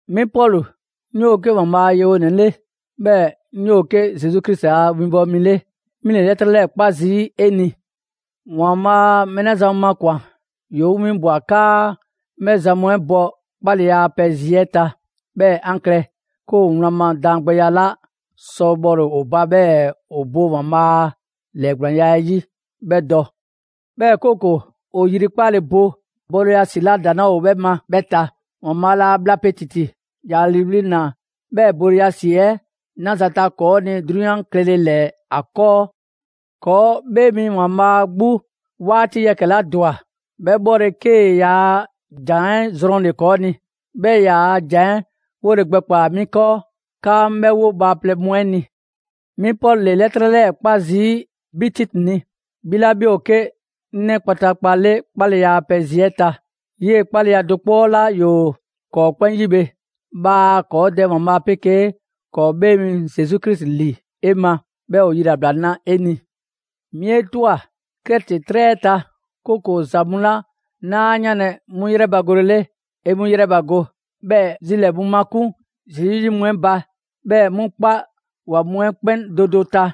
'Mi Pɔlu, 'ŋ 'yoo‑ 'ke ‑Waanbhaa' a yewonɛ 'le, 'bhɛɛ‑ 'ŋ 'yoo‑ 'ke Zesu Krisi a winbɔwo mi 'le; 'mi ‑le 'lɛtrɛ 'lɛɛ‑ 'kpa zii' 'e ni. ‑Waanbhaa' mɛɛ 'la zan mu makwan‑, ‑yoo 'ŋ 'winbwa‑ 'kaa 'ŋ 'bhɛ zan mu 'ɛ bɔ 'kpaleya a pɛ zi 'ɛ ta, 'bhɛɛ‑ 'an klɛ 'ke ‑o wlan ma daangbɛya 'la sɔ bhɔle‑ ‑o ba, 'bhɛɛ‑ ‑o bo ‑Waanbhaa' a ‑lɛɛgblaanya 'ɛ 'yi 'bhɛ dɔ. 'Bhɛɛ‑ 'kooko‑ ‑o yrikpale bo bole ‑yrɛ ma ‑si 'la ‑daŋ 'laa ‑o 'bhɛ ma 'bhɛ ta. ‑Waanbhaa' laa bhla pe ‑titi, ‑ya ‑liiwli' ‑naa 'bhɛɛ‑ bole ‑yrɛ ma ‑si 'ɛ 'naza‑ ta ‑kɔɔ' ni 'drunyan klɛle ‑lɛɛ ‑a 'kɔɔ. ‑Kɔɔ' 'Bhee Mi ‑Waanbhaa' 'gbu 'waati yɛkɛ‑ 'la ‑dwa 'bhɛ 'bhɔle‑, 'kee‑ yaa ‑Jan 'ɛ zrɔnle‑ ‑kɔɔ' ni. 'Bhɛɛ‑ ‑e ‑yaa' ‑Jan 'ɛ 'wole gbɛkpaa‑ 'mi 'kɔɔ, 'kaa 'ŋ 'bhɛ 'wo bhaaplɛŋ mu 'ɛ ni. 'Mi Pɔlu ‑le 'lɛtrɛ 'lɛɛ‑ 'kpa zii' 'bhi Titi ni, 'bhi 'la 'bhi ‑o 'ke 'ŋ 'nɛ kpataakpa 'le 'kpaleya a pɛ zi 'ɛ ta, 'yee‑ 'kpaleya do 'kpɔ 'la ‑yoo ‑kɔɔ 'kpɛn 'yi bhe. Bhaa ‑kɔɔ' Dɛ ‑Waanbhaa' 'pegee ‑kɔɔ' 'Bhee mi Zesu Krisi ‑li 'e ma, 'bhɛɛ‑ ‑o yilabla na 'e ni! 'Mi 'e ꞊twa Krɛti 'trɛ 'ɛ ta, 'kooko‑ ‑za mu 'la 'naa 'yanlɛ‑ 'mu yrɛbagolele, 'e 'mu ‑yrɛbago. 'Bhɛɛ‑ zilɛɛ‑ mu makun' Zesu 'yi mu 'ɛ ba, 'bhɛɛ‑ 'mu 'kpa ‑wa mu 'ɛ 'kpɛn do do ta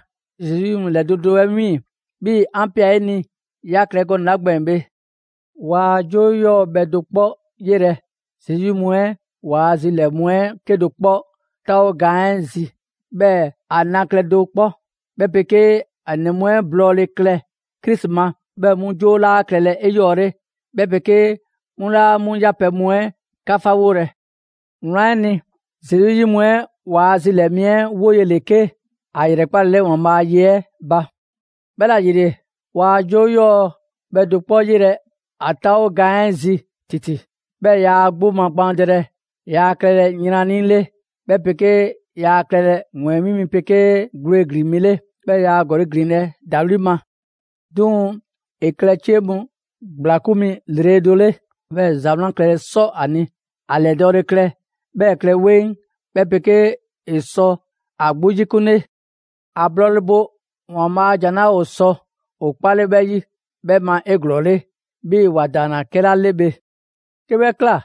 Zesu 'yi mu ‑lɛ do do 'ɛ 'wiiŋ‑, 'bhii‑ 'an ꞊pia 'e ni ꞊ya klɛ gɔnɛ‑ 'la gbɛɛn‑ bhe. Waa 'joo 'yɔɔ‑ bhɛ do 'kpɔ 'yelɛ‑ Zesu 'yi mu 'ɛ ‑waa' zilɛɛ‑ mu 'ɛ 'kedo‑ 'kpɔ 'taawo gaan 'ɛ zi, 'bhɛɛ‑ ‑a na klɛ do 'kpɔ, 'bhɛ 'pegee ‑a ‑nɛ mu 'ɛ ‑blɔɔle' klɛ Krisi ma. 'Bhɛɛ‑ 'mu 'joo 'laa klɛlɛ 'eyɔɔle, 'bhɛ 'pegee 'mu 'laa 'mu yapɛ mu 'ɛ 'kafawolɛ. Wlan 'ɛ ni, Zesu 'yi mu 'ɛ ‑waa' zilɛɛ‑ mi 'ɛ 'woye‑ ‑le 'ke ‑a ‑yrɛkpalele ‑Waanbhaa' a ye 'ɛ ba. 'Bhɛla‑ ‑yile, waa 'joo 'yɔɔ‑ bhɛ do 'kpɔ 'yelɛ‑ ‑a 'taawo gaan 'ɛ zi ‑titi. 'Bhɛɛ‑ yaa ‑a 'gbu magbaandɛlɛ, yaa klɛlɛ yrannii‑ 'le, 'bhɛ 'pegee yaa klɛlɛ ‑wɛɛnmi' mi 'pegee gwle ‑glin mi 'le, 'bhɛɛ‑ yaa ‑gɔli' ‑glinlɛ' ‑dawli' ma. 'Duŋ‑ ‑e klɛ 'cie mu ‑gblakun' mi ‑lrele' do 'le, 'bhɛɛ‑ ‑za 'wlan klɛle 'sɔ ‑a ni. ‑A ‑lɛdɔɔle klɛ, 'bhɛɛ‑ ‑e klɛ 'weŋ, 'bhɛ 'pegee ‑e sɔ ‑a 'gbu 'yikunle. ‑A blɔɔle bo ‑Waanbhaa' a ‑Jan 'la ‑o sɔ ‑o 'kpale 'bhɛ 'yi 'bhɛ ma 'eglɔɔle, 'bhii‑ ‑wa ‑daanna 'kɛla 'le bhe. 'Ke 'bhɛ ꞊kla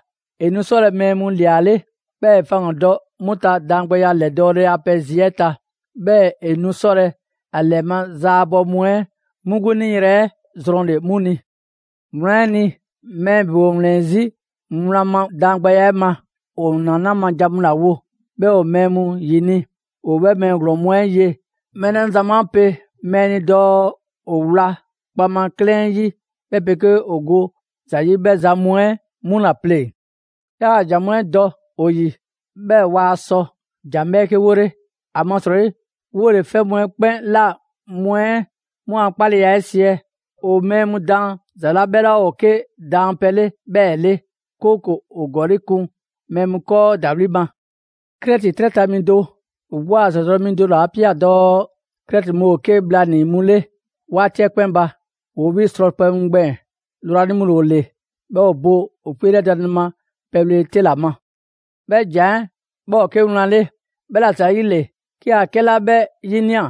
‑e nu 'sɔlɛ‑ mɛɛ mu ‑liale', 'bhɛɛ‑ ‑e faŋgandɔ 'mu ta daangbɛya ‑lɛdɔɔle a pɛ zi 'ɛ ta. 'Bhɛɛ‑ ‑e nu 'sɔlɛ‑ ‑a ‑lɛma' zaabɔ mu 'ɛ 'mu 'gbu 'niyrɛ‑ 'ɛ zrɔnle‑ 'mu ni. Wlan 'ɛ ni, mɛɛ ‑bebe ‑o ‑wlɛn 'zi wlan ma daangbɛya 'ɛ ma. ‑O ‑naanaa' ma jan mu ‑la wo, 'bhɛɛ‑ ‑o mɛɛ mu ‑yini'. ‑O 'bhɛ mɛɛ ‑glɔɔn mu 'ɛ ye mɛɛ 'la zan mu 'a pe mɛɛ ni dɔɔ ‑o wla kpaŋma 'klɛɛn 'yi 'bhɛɛ‑ ‑o go ‑za 'yi 'bhɛ zan mu 'ɛ 'mu ‑la pleŋ‑. 'Yaa‑ ‑jan mu 'ɛ dɔ ‑o ‑yi, 'bhɛɛ‑ waa sɔ ‑jan 'bhɛɛke 'wole; ‑amasrɔyi, 'wole‑ 'fɛ mu 'ɛ 'kpɛn ꞊la mu 'ɛ 'mu a 'kpaleya 'ɛ siɛ. ‑O mɛɛ mu daan ‑za 'la 'bhɛ 'laa ‑o 'ke daanpɛ 'le 'bhɛɛ‑ 'le, 'kooko‑ ‑o ‑gɔli' kun mɛɛ mu 'kɔɔ ‑dawli' ma. Krɛti 'trɛ ta mi do, ‑o 'gbu a ‑zadɔ' mi do ‑le 'a ꞊pia dɔɔ: «Krɛti mu ‑o 'ke bhlanii‑ mu 'le 'waati 'ɛ 'kpɛn ba, ‑woo 'bhii‑ srɔpɛ mu gbɛɛn‑, lrwanii‑ mu ‑le ‑o ‑le, 'bhɛɛ‑ ‑o bo ‑o 'kpeelɛdanle ma pɛ bhlele 'te ‑la ma.» 'Bhɛ ‑jan 'ɛ, 'bhɛ ‑o 'ke wlan 'le. 'Bhɛla‑ ‑zayile, 'ke 'a 'kɛla 'bhɛ 'yinia‑,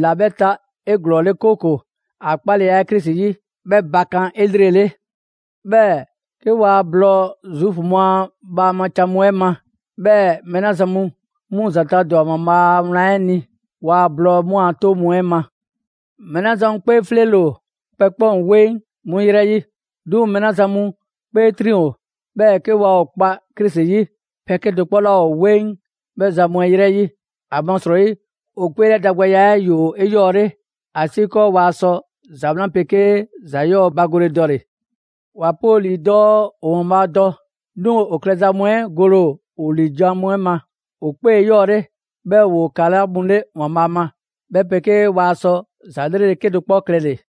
‑la 'bhɛ ta 'eglɔɔle, 'kooko‑ ‑a 'kpaleya 'ɛ Krisi 'yi 'bhɛ bakan' 'elrele. 'Bhɛɛ‑ 'ke waa blɔɔ Zuufu mu a bhaama can mu 'ɛ ma, 'bhɛɛ‑ mɛɛ 'la zan mu 'mu ‑zanta' ‑dwa ‑Waanbhaa' a wlan 'ɛ ni, waa blɔɔ 'mu a 'toŋ mu 'ɛ ma. Mɛɛ 'la zan mu 'kpee 'fleele‑ ‑o, pɛ 'kpɛn ‑o 'weŋ 'mu ‑yrɛ 'yi. 'Duŋ‑ mɛɛ 'la zan mu 'kpee 'triŋ‑ ‑o, 'bhɛɛ‑ 'ke waa ‑o kpa Krisi 'yi, 'pɛ 'kedo‑ 'kpɔ 'laa ‑o 'weŋ 'bhɛ zan mu 'ɛ ‑yrɛ 'yi. ‑Amasrɔyi ‑o 'kpeelɛdangbɛya 'ɛ ‑yoo 'eyɔɔle, ‑asiikɔɔ waa sɔ ‑za 'wlan 'pegee ‑za 'yɔɔ‑ bagole dɔle‑. ‑Wa pe ‑o ‑lii dɔɔ ‑o ‑Waanbhaa' dɔ, 'duŋ‑ ‑o klɛza mu 'ɛ gole ‑o ‑o ‑liijan' mu 'ɛ ma. ‑O 'kpee ‑o 'eyɔɔle, 'bhɛɛ‑ ‑woo ‑kala' mu 'le ‑Waanbhaa' ma, 'bhɛ 'pegee waa sɔ ‑za 'lrele‑ 'kedo‑ 'kpɔ klɛle‑.